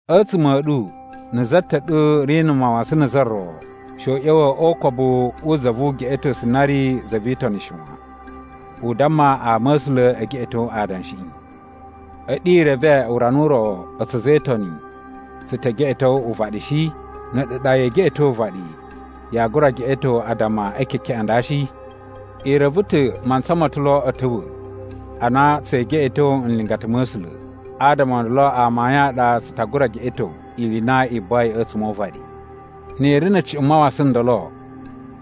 A̱tsuma̱ a̱ ɗu na̱ za ta̱ ɗu ri na̱ mawasan na̱ za ro, she u ꞌya̱wa̱ o ukobu wu za vu ugeꞌetosu na ri za vi Itoni shi wan. U damma ama a̱ A̱sula̱ e geꞌeto adanshiꞌi. A̱ɗu i reve urana u ro a̱tsu a̱za̱ e Itoni tsu ta̱ geꞌeto uvaɗi shi? Na̱ a̱ɗu ɗa yee geꞌeto uvaɗi, yaa gura geꞌeto addama e kekeꞌen a nda shi? I reve ta̱ mantsa ma̱ ta̱ lo a̱ ta̱wa̱ a na tsee geꞌeto nlingata ma̱ A̱sula̱, adama o ndolo amayun a ɗa tsu ta gura geꞌeto ili i na i buwai a̱tsuma̱ o uvaɗi. Ni i ri na̱ cuꞌun mawasan ndolo,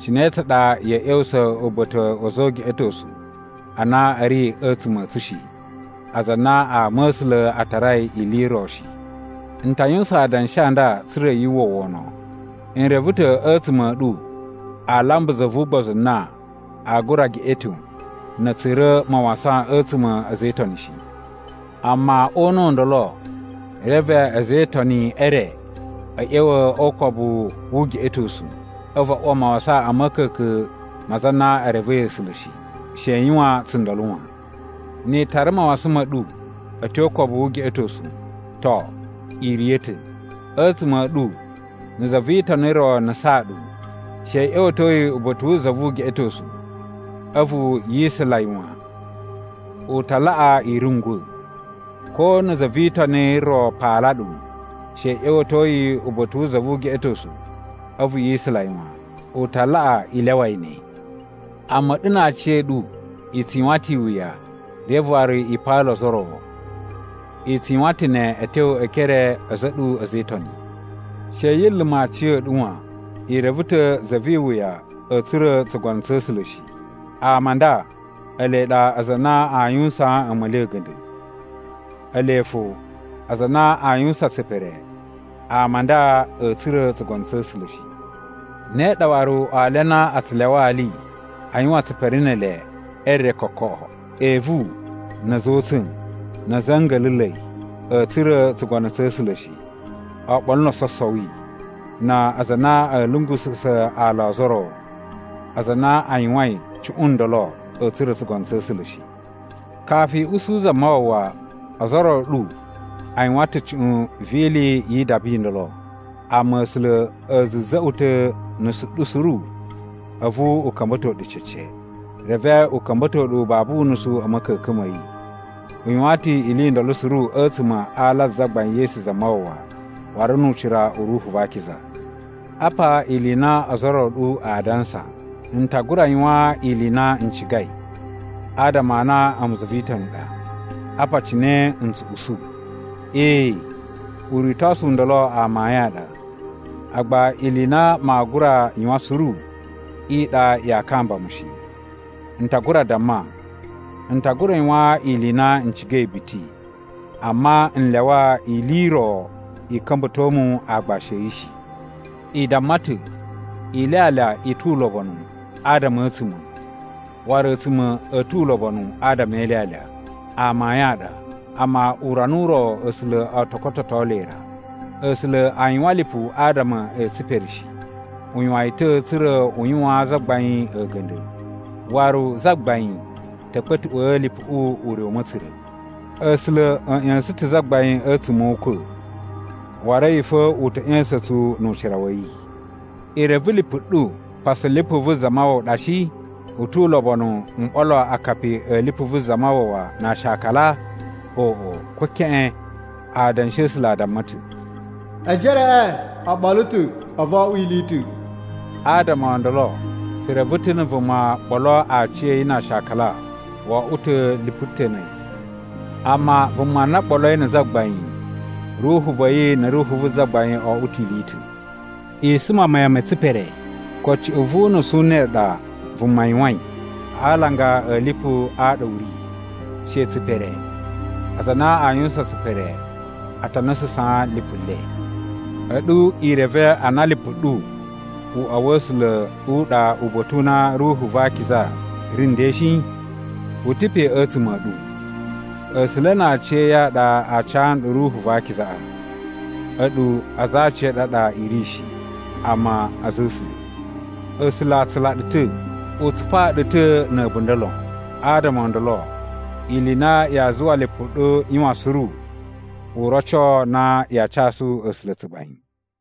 cine tsa ɗa ya̱a̱ ꞌya̱wusa̱ uba̱ta̱ wa̱ a̱za̱ o ugeꞌetosu a na a̱ ri a̱tsuma̱ a̱ tsu shi, aza a na ama a̱ A̱sula̱ a tarai ili i ro shi? N ta yuwusan adanshi a nda tsa̱ra̱ yu uwwa wono. N reve ta̱ a̱tsuma̱ a̱ ɗu aa lamba za vu ugbozu na aa gura geꞌeto na̱ a̱ tsura̱ mawasan a̱tsuma̱ a̱ a̱za̱ e Itoni shi. Amma o una̱ u ndolo, reve a̱za̱ e Itoni e re a̱ ꞌya̱wa̱ o ukobu wu ugeꞌetosu, a̱vu a uwa mawasan a̱ ma̱ka̱ka̱n ma aza a na e revei A̱sula̱ shi. She i yuwan tsundolo wan! Ni i tara mawasan ma̱ ɗu a̱ tyo o ukobu wu ugeꞌetosu, to, i riya̱ ta̱. A̱tsuma̱ a̱ ɗu na̱ za vi Itoni ro nusaan ɗu, she i ꞌya̱wa̱to yi uba̱ta̱ wu za vu ugeꞌetosu a̱vu yi isula yi wan. U ta laꞌa i rungwa̱. Ko na̱ za vi Itoni ro paala ɗu, she i ꞌya̱wa̱to yi uba̱ta̱ wu za vu ugeꞌetosu a̱vu yi isula yi wan. U ta laꞌa i lyawa yi ne. Amma a̱ɗu na aciya̱ɗu i tsu yuwan ta̱ iwuya reve waru i paala ozo o ro, i tsu yuwan ta̱ ne a̱ tyo e ekere a̱za̱ a̱ ɗu a̱za̱ e Itoni! She yi luma̱ aciya̱ɗu wan. I reve ta̱ za vi iwuya a̱a̱ tsura̱ tsugono tsa̱ A̱sula̱ shi. Ama a nda ele ɗa aza a na a yuwusaan a̱ma̱li a̱ a̱ga̱nda̱. Ele fo aza a na a yuwusan tsipere, ama a nda a̱a̱ tsura̱ tsugono tsa̱ A̱sula̱ shi. Ne ɗa waru ali a na a tsu lyawa ali a yuwan tsipere ne ele e re kokoꞌo. Evu, na̱ a̱za̱ o utsa̱n, na̱ a̱za̱ a̱ nga̱la̱la̱i a̱a̱ tsura̱ tsugono tsa̱ A̱sula̱ shi, oɓolo no ososowi, na aza a na a̱ lungususa̱ ala o ozo o ro. Aza a na a yuwain cuꞌun ndolo a̱a̱ tsura̱ tsugono tsa̱ A̱sula̱ shi. Kafu i usu Zamawawa, ozo o ro a̱ ɗu a yuwan ta̱ cuꞌun vi ili yi idaba i ndolo. Amma A̱sula̱ a̱ za̱za̱ꞌwa̱ ta̱ nusu ɗu suru a̱vu u ka̱mba̱to ɗu cece, reve u ka̱mba̱to ɗu babu unusu a̱ ma̱ka̱ka̱n ma̱ yi. U yuwan ta̱ ili i ndolo suru a̱tsuma̱ a ala a Zagbain Yesu Zamawawa waru nu ucira u Ruhu va Akiza. Apa ili i na ozo o ro a̱ ɗu a dansa: “N ta gura yuwan ili i na n cigai, adama a na a̱mu za vi Itoni ɗa.” Apa cine n tsu usu: “Ee, uritosu u ndolo amayun a ɗa. Agba ili i na maa gura yuwan suru i ɗa yaa kamba mu shi.” N ta gura damma, “N ta gura yuwan ili i na n cigai biti,” amma n lyawa ili i ro i ka̱mba̱to mu aagbashi a̱ yi shi. I damma ta̱, “Ilyalya i tu ulobonu adama a̱ a̱a̱tsuma̱, waru a̱a̱tsuma̱ a̱ tu ulobonu adama e ilyalya.” Amayun a ɗa, amma urana u ro A̱sula̱ o to kototo le ra. A̱sula̱ a yuwan lipu adama e tsipere shi. U yuwan yi ta̱ tsa̱ra̱ u yuwaan Zagbain a̱ga̱nda̱, waru Zagbain ta̱ kpa̱tuꞌwa̱a̱ lipuꞌu ure u ma̱tsura̱. A̱sula̱ a̱ ꞌya̱sa̱n ta̱ Zagbain a̱tsuma̱ o ukwa̱, waru a̱yi fo u ta̱ ꞌya̱sa̱n tsu nu ucira wa̱ yi. I reve lipu ɗu pasu lipu vu Zamawawa ɗa shi? U tu ulobonu m ɓolo akapi a̱ lipu vu Zamawawa na aashakala? Oꞌo, ko keꞌen! Adanshi a̱ A̱sula̱ a damma ta̱, “Ejereꞌe o ɓolo ta̱ a̱vu o oꞌwo ili i ta̱.” Adama o ndolo, tsu reve ta̱ na̱ vuma ɓolo aciya̱yi na aashakala, wo oꞌwo ta̱ lipu ta̱ na̱ a̱yi. Amma vuma na ɓoloi na̱ Zagbain, ruhu va̱ yi na̱ ruhu vu Zagbain o oꞌwo ta̱ ili i ta̱. I suma mayan me tsipere. Ko cuꞌun vu unusu u ne u ɗa vuma yuwain a alanga a̱ lipu a ɗa u ri, she tsipere. Aza a na a yuwusan tsipere a ta nususaan lipu le. A̱ɗu i reve a na lipu ɗu uꞌwa wa̱ A̱sula̱ u ɗa uba̱ta̱ u na Ruhu va Akiza ri nden shi? U ta̱ pe a̱tsuma̱ a̱ ɗu. A̱sula̱ na aciya̱yi a ɗa a ca nɗu Ruhu va Akizaꞌa. A̱ɗu aza a aciya̱ɗu a ɗa i ri shi, amma a̱za̱ a̱ A̱sula̱. A̱sula̱ a tsula ɗu ta̱. U tsupaa ɗu ta̱ na̱ a̱bunda̱ lon. Adama o ndolo, ili i na yaa zuwa lipu ɗu yuwan suru u roco na yaa casu A̱sula̱ tsugbain.